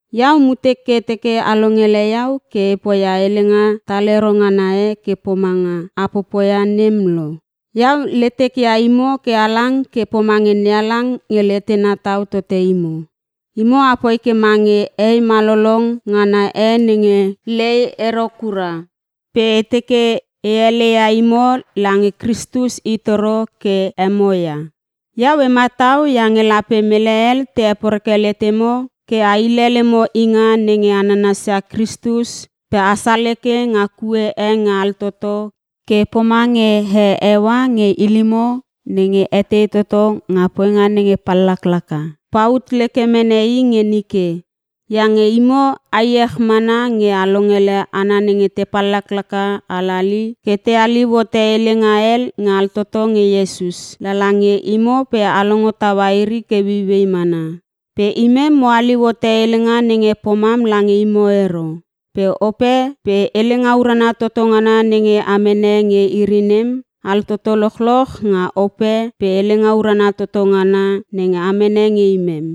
Iau mutek ke e teke a longele iau ke e poia helenga talero ngana e ke pomanga a popoia nem lo. Iau letek ia imo ke halang ke pomange NeHalang nge letena tau tote imo. Imo apoi ke mange hei malolong ngana e nenge lei ero kura pe e teke e heleia imo lange Kristus i toro ke emo ia. Iau e matau iange lape mele hel te heporeke letemo ke a hile lemo inga nenge a nanasia Kristus pe a saleke nga kue e nge altoto ke pomange he Eua nge ilimo nenge etei toto nga poinga nenge pallaklaka, paut leke mene i nge nike. Iange imo a iech mana nge a longele hana nenge te pallaklaka halali ke te haliu hote helenga hel nge altoto nge Iesus, lala nge imo pe a longo taua iri ke ueiuei mana. Pe imem mo haliu hote helenga nenge pomam lange imo ero. Pe ope pe helenga urana toto ngana nenge a mene nge iri nem altoto lochloch nga Ope pe helenga urana toto ngana nenge a mene nge imem.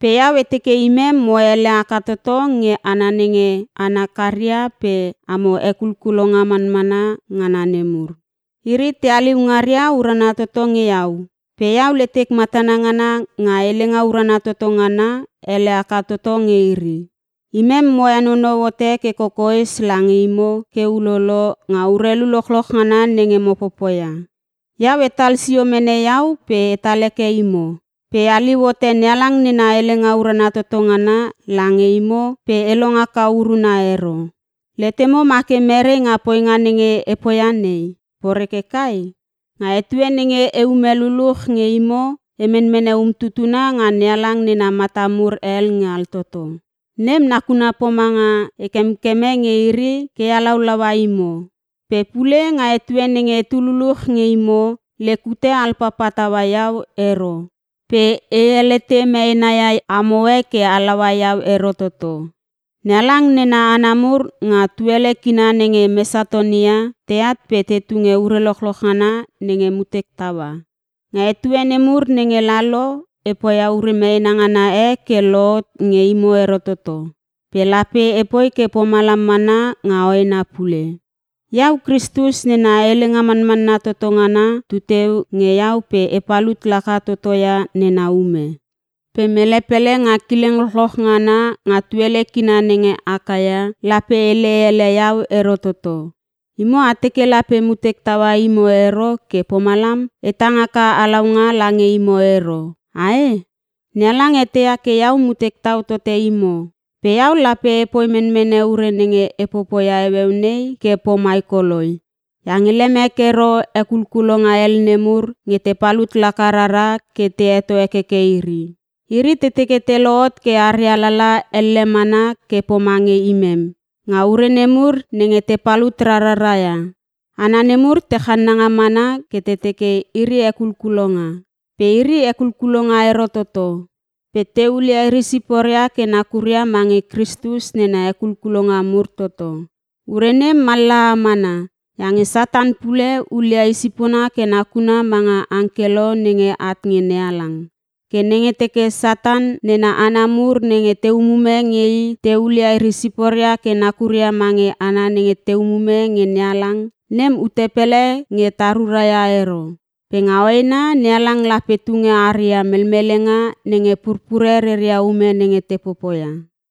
Pe iau e teke imem mo ele haka toto nge hana nenge hana karia pe “amo hekulkulonga manmanna ngana nemur.” Iri te haliu ngaria urana toto nge iau. Pe iau letek matana ngana nga helenga urana toto ngana, ele haka toto nge iri. Imem mo henonou hote ke kokoes lange imo ke ulolo nga urelu lochloch ngana nenge mo popoia. Iau etal sio mene iau pe etal heke imo. Pe e haliu hote NeHalang nena helenga urana toto ngana lange imo pe e long haka uruna ero. Letemo ma ke merei nga poinga nenge e poia nei, poreke kai? Nga etue nenge eume luluch nge imo e menmene umtutuna nga NeHalang nena mata mur hel nge altoto. Nem nakuna pomanga e kemkeme nge iri ke e halaulaua imo. Pe pule nga etue nenge etu luluch nge imo, lek ute alpapa taua iau ero pe e helete meena ia amoe ke halaua iau ero toto. NeHalang nena hana mur nga tuele kina nenge Mesatonia, teat pe te tunge ure lochloch ngana nenge mutek taua. Nga etue nemur nenge lalo e poia ure meena ngana e ke lohot nge imo ero toto, pe lape epoi ke pomalam mana nga hoena pule. Iau, Kristus nena helenga manmanna toto ngana tuteu nge iau pe e palut laka toto ia nena ume. Pe mele pele nga kileng lochloch ngana nga tuele kina nenge Akaia lape hele ele iau ero toto. Imo a teke lape mutek taua imo ero ke pomalam e tang haka halaunga lange imo ero, ae? NeHalang eteia ke iau mutek tau tote imo. Pe iau lape epoi menmene ure nenge e popoia heueu nei ke pomai koloi iange lemek ero “hekulkulonga hel nemur” nge te palut laka rara ke te heto hekeke iri. Iri te teke te lohot ke aria lala elle mana ke pomange imem, nga ure nemur nenge te palut rarara ia. Hana nemur te channanga mana ke te teke iri hekulkulonga. Pe iri hekulkulonga ero toto. Pe te hulia iri siporia ke nakuria mange Kristus nena hekulkulonga mur toto. Ure nem mallaha mana iange Satan pule hulia i sipona ke nakuna manga angkelo nenge at nge NeHalang. Ke nenge teke Satan nena hana mur nenge te umume nge i te hulia iri siporia ke nakuria mange hana nenge te umume nge NeHalang, nem ute pele nge ta ruraia ero. Pe nga hoena NeHalang lape tunge aria melmelenga nenge purpure reria ume nenge te popoia.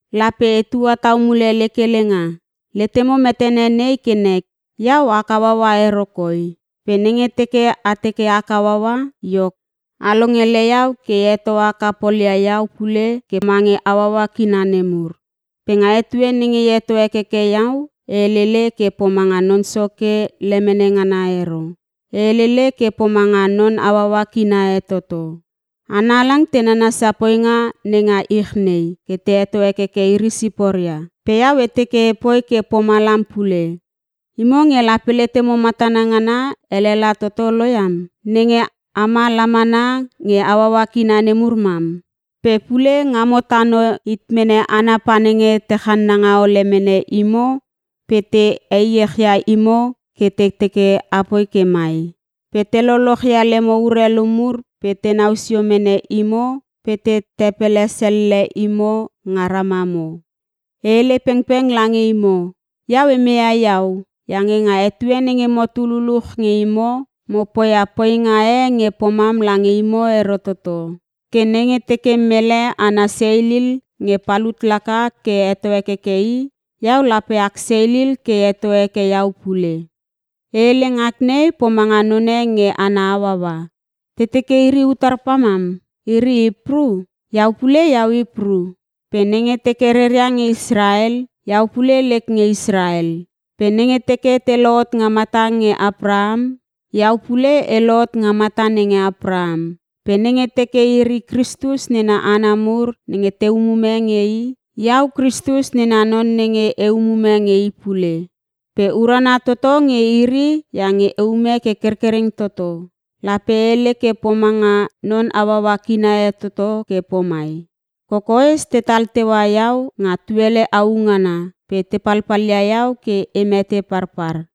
Lape etua tau mule lek helenga. Letemo metene nei ke nek, iau ak hauaua ero koi. Pe nenge teke a teke ak hauaua, iok a longele iau ke e heto haka polia iau pule ke mange hauaua kina nemur. Pe nga etue nenge e heto hekeke iau e helele ke pomanga Non Soke lemene ngana ero, e helele ke pomanga non hauaua kina e toto. Hana halang te nanasia poinga nenga ich nei ke te heto hekeke iri siporia, pe iau e teke epoi ke pomalam pule. Imo nge lape letemo matana ngana elela toto lo iam, nenge ama la mana nge hauaua kina nemur mam! Pe pule ngamo tano hit mene hana panenge te channanga ole mene imo pe te echia imo ke te teke apoi ke mai, pe te loloch ia lemo urelu mur pe tenau sio mene imo pe te tepele selle imo nga ramamo. E hele pengpeng lange imo, iau e meia iau iange nga etue nenge motu luluch nge imo, mo poia poinga e nge pomam lange imo ero toto. Ke nenge teke mele ana seilil nge palut laka ke heto hekeke i, iau lape ak seilil ke e heto heke iau pule. (E hele ngak nei pomanga none nge ana hauaua.) Te teke iri utar pamam, iri Hipru? Iau pule iau Hipru. Pe nenge teke reria nge Israel, iau pule lek nge Israel. Pe nenge teke te lohot nga mata nenge Apraham, iau pule e lohot nga mata nenge Apraham. Pe nenge teke iri Kristus nena hana mur nenge te umume nge i, iau Kristus nena non nenge e umume nge i pule, pe e urana toto nge iri iange eume ke kerkereng toto. (Lape e hele ke pomanga non hauaua kina e toto ke pomai.) Kokoes tetal teua iau nga tuele au ngana pe te palpalia iau ke e mete parpar.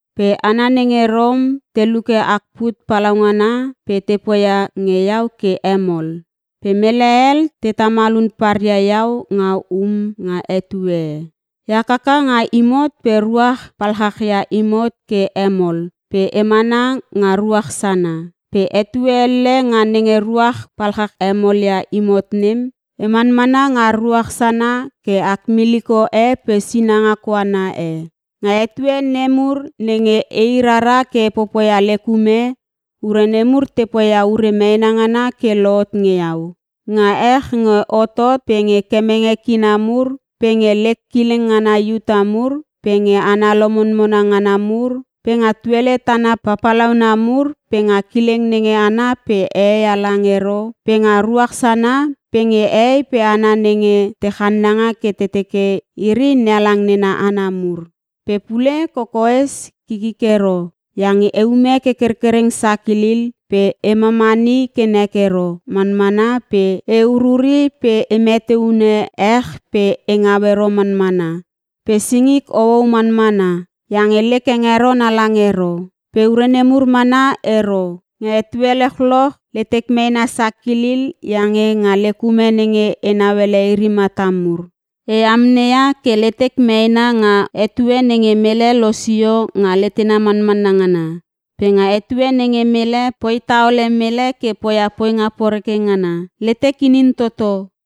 Pe hana nenge Rom te luke ak put palaungana pe te poia nge iau ke hemol. Pe mele hel te tamal hun paria iau nga um nga etue e. E hakaka nga imot pe ruach palchachia imot ke hemol pe emana nga ruach sana. Pe etue elle nga nenge ruach palchach hemol ia imot nem, e manmana nga ruach sana ke ak miliko e pe sinanga koana e. Nga etue nemur nenge ei rara ke e popoia lek ume, ure nemur te poia ure meena ngana ke lohot nge iau; Nga ech nge hotot pe nge kemenge kina mur pe nge lek kileng ngana Iuta mur pe nge hana lomonmona ngana mur pe nga tuele tana papalauna mur pe nga kileng nenge ana hehei pe hana halang ero pe nga ruach sana pe nge hehei pe hana nenge te channanga ke te teke iri NeHalang nena hana mur. Pe pule kokoes kikik ero iange eume ke kerkereng sakilil pe e mamani ke nek ero manmana pe e ururi pe e mete unune ech pe e ngau ero manmana pe singik houou manmana iange lek hengeron halang ero. Pe ure nemur mana ero. Nga etue lochloch letek meena sakilil iange nga lek ume nenge enau ele iri mata mur. E amneia ke letek meena nga etue nenge mele losio nga letena manmanna ngana. Pe nga etue nenge mele poi taole mele ke poia poinga poreke ngana, letek inin toto.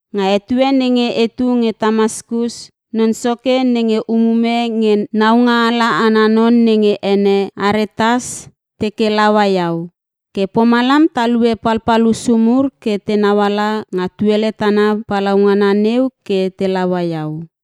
Nga etue nenge etu nge Tamaskus non soke nenge umume nge naungaala ana non nenge ene Aretas teke laua iau. Ke pomalam talue palpal hussu mur ke tenau ala nga tuele tana palaungana neu ke te laua iau.